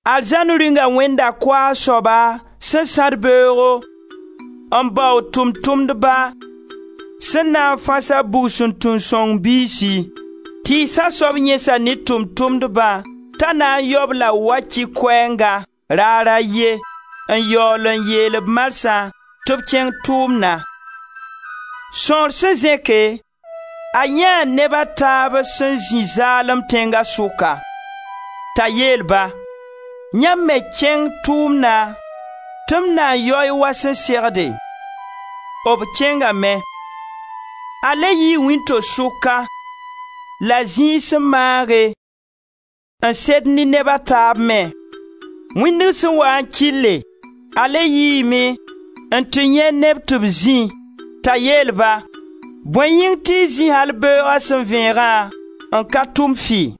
Arzãn Rĩunga wẽnda koaag soaba sẽn sãd beoogo n bao tʋʋm-tʋmdba sẽn na n fãs a bugsuntung sõng biisi. Tɩɩsa soab yẽsa ne tʋʋm-tʋmdba t'a na n yao-b la waki koɛɛnga, raar a ye, n yaool n yeel-b marsã tɩ b kẽng tʋʋmna. Sõor sẽn zẽke, a yãee neb a taaba sẽn zĩ zaalem tẽnga sʋka, t'a yeel-ba: ‹Yãmb me kẽng tʋʋmna tɩ m na yao-y wa sẽn segde.› B kẽngame. A le yii wĩnto-sʋka la zĩig sẽn maage n sed ne neb a taab me. Wĩndg sẽn waa n kɩlle, a le yiime n tɩ yãe neb tɩ b zĩ, t'a yeel-ba: ‹Bõe yĩng tɩ y zĩ al beooga sẽn vẽegã n ka tʋm fɩ?›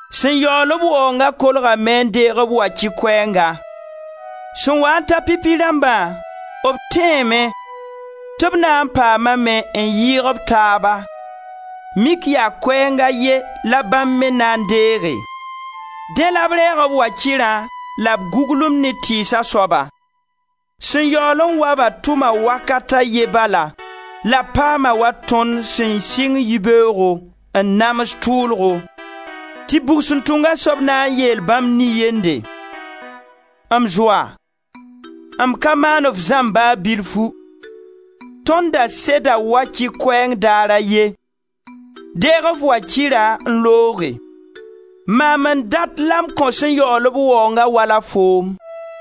Sẽn yaool-b waoongã kolgame n deeg b wakɩr koɛɛnga. Sẽn waa n ta pipi rãmbã, b tẽeme tɩ b na n paamame n yɩɩg b taaba, mik yaa koɛɛng a ye la bãmb me na n deege. Dẽ la b reeg b wakirã la b guglumd ne tɩɩsa soaba: ‹Sẽn yaool n wa-ba tʋma wakat a ye bala la b paama wa tõnd sẽn sɩng yibeoogo, n nams tʋʋlgo.› Tɩ bugsuntunga soab na n yeel bãmb nin-yende: ‹M zoa, m ka maan f zãmb ba bilfu; tõnd da seda wakɩ-koɛɛng daar a ye. Deeg f wakirã n looge. Maam n dat la m kõ sẽn yaool-b waoongã wala foom;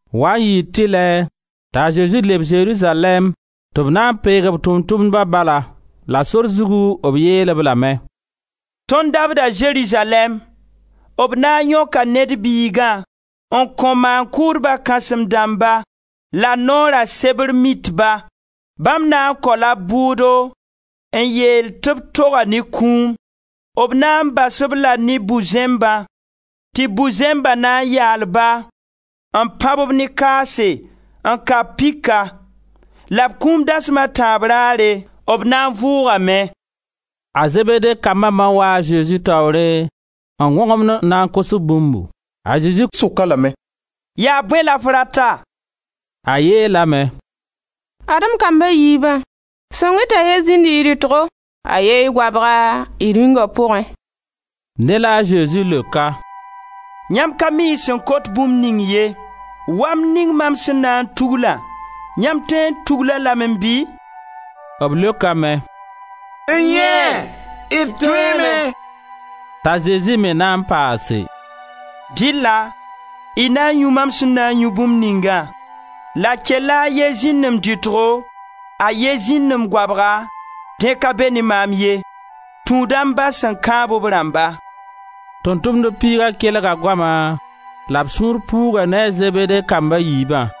Waa n yɩɩ tɩlɛ t'a Zezi leb Zerizalɛɛm tɩ b na peeg Tʋʋm-tʋmdba bala; la sor zugu b yeel-b lame: «Tõnd dabda Zerizalɛɛm; b na n yõka Ned Biigã n kõ Maan-kʋʋdba kãsem dãmba la Noora sebr Mitba; bãmb na n kao-la b bʋʋdo n yeel tɩ b toga ne kũum. B na n bas-b-la ne bu-zẽmbã, tɩ bu-zẽmba na n yaal ba, n pãb-b ne kaase, n ka-b pika. La b kũum dasm a tãab rare, b na n vʋʋgame.» A Zebede kamba ma waa a Zezi taoore n wõgemd n na n kos bũmbu. A Zezi sok-a lame: «Yaa bõe la f rata?» A yeelame: «Ad-m kamb a yiibã, sõng-y t'a ye zĩnd y rɩtgo, a ye y goabga, y Rĩunga pʋgẽ.» Dẽ la a Zezi leok-a: «Yãmb ka mi y sẽn kot bũmb ning ye. Wamd ning mam sẽn na n tuglã, yãmb tõe n tugl-a lame bɩ?» B leokame: «N-yẽe! D tõeeme.» T'a Zezi me na n paase: «Dɩlla y na yũ mam sẽn na n yũ bũmb ningã la kella a ye zĩnd m dɩtgo, a ye zĩnd m goabga, dẽ ka be me maam ye, tũuda m Ba sẽn kãab b rãmba.» Tʋʋm-tʋmdb piiga kelga goama la b sũur puuga ne a Zebede kamb a yiibã.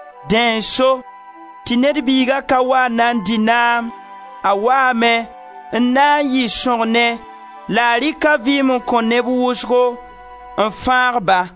Dẽ n so tɩ Ned Biiga ka wa n na n dɩ naam, a waame n na n yɩ sõgne la a rɩk a vɩɩm n kõ neb wʋsgo, n fãag-ba.»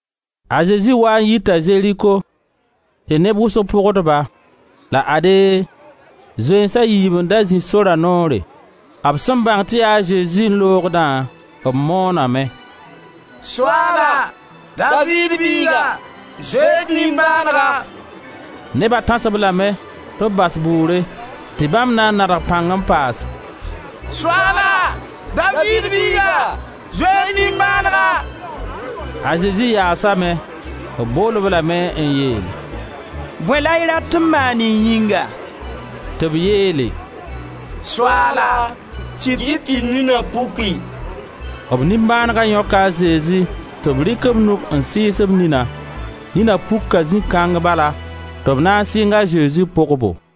A Zezi waa n yita Zeriko tɩ neb wʋsg pʋgd-ba. La ade, zoeens a yiib n da zĩ sora noore; b sẽn bãng tɩ yaa a Zezi n loogdã, b mooname: «Soaala, Daviid biiga, zoe-y d nimbãanega!» Neba tãs-b lame tɩ b bas bʋʋre, tɩ bãmb na n nadg pãng n paas: «Soaala, Daviid biiga, zoe-y d nimbãanega!» A Zezi yaasame; b bool-b lame n yeel: «Bõe la y rat tɩ m maan y yĩnga?» Tɩ b yeele: «Soaala, kɩt-y tɩ d nina puki.» B nimbãanega yõka a Zezi tɩ b rɩk b nug n sɩɩs b nina. Nina puka zĩ kãng bala tɩ b na n sɩng a Zezi pʋgbo.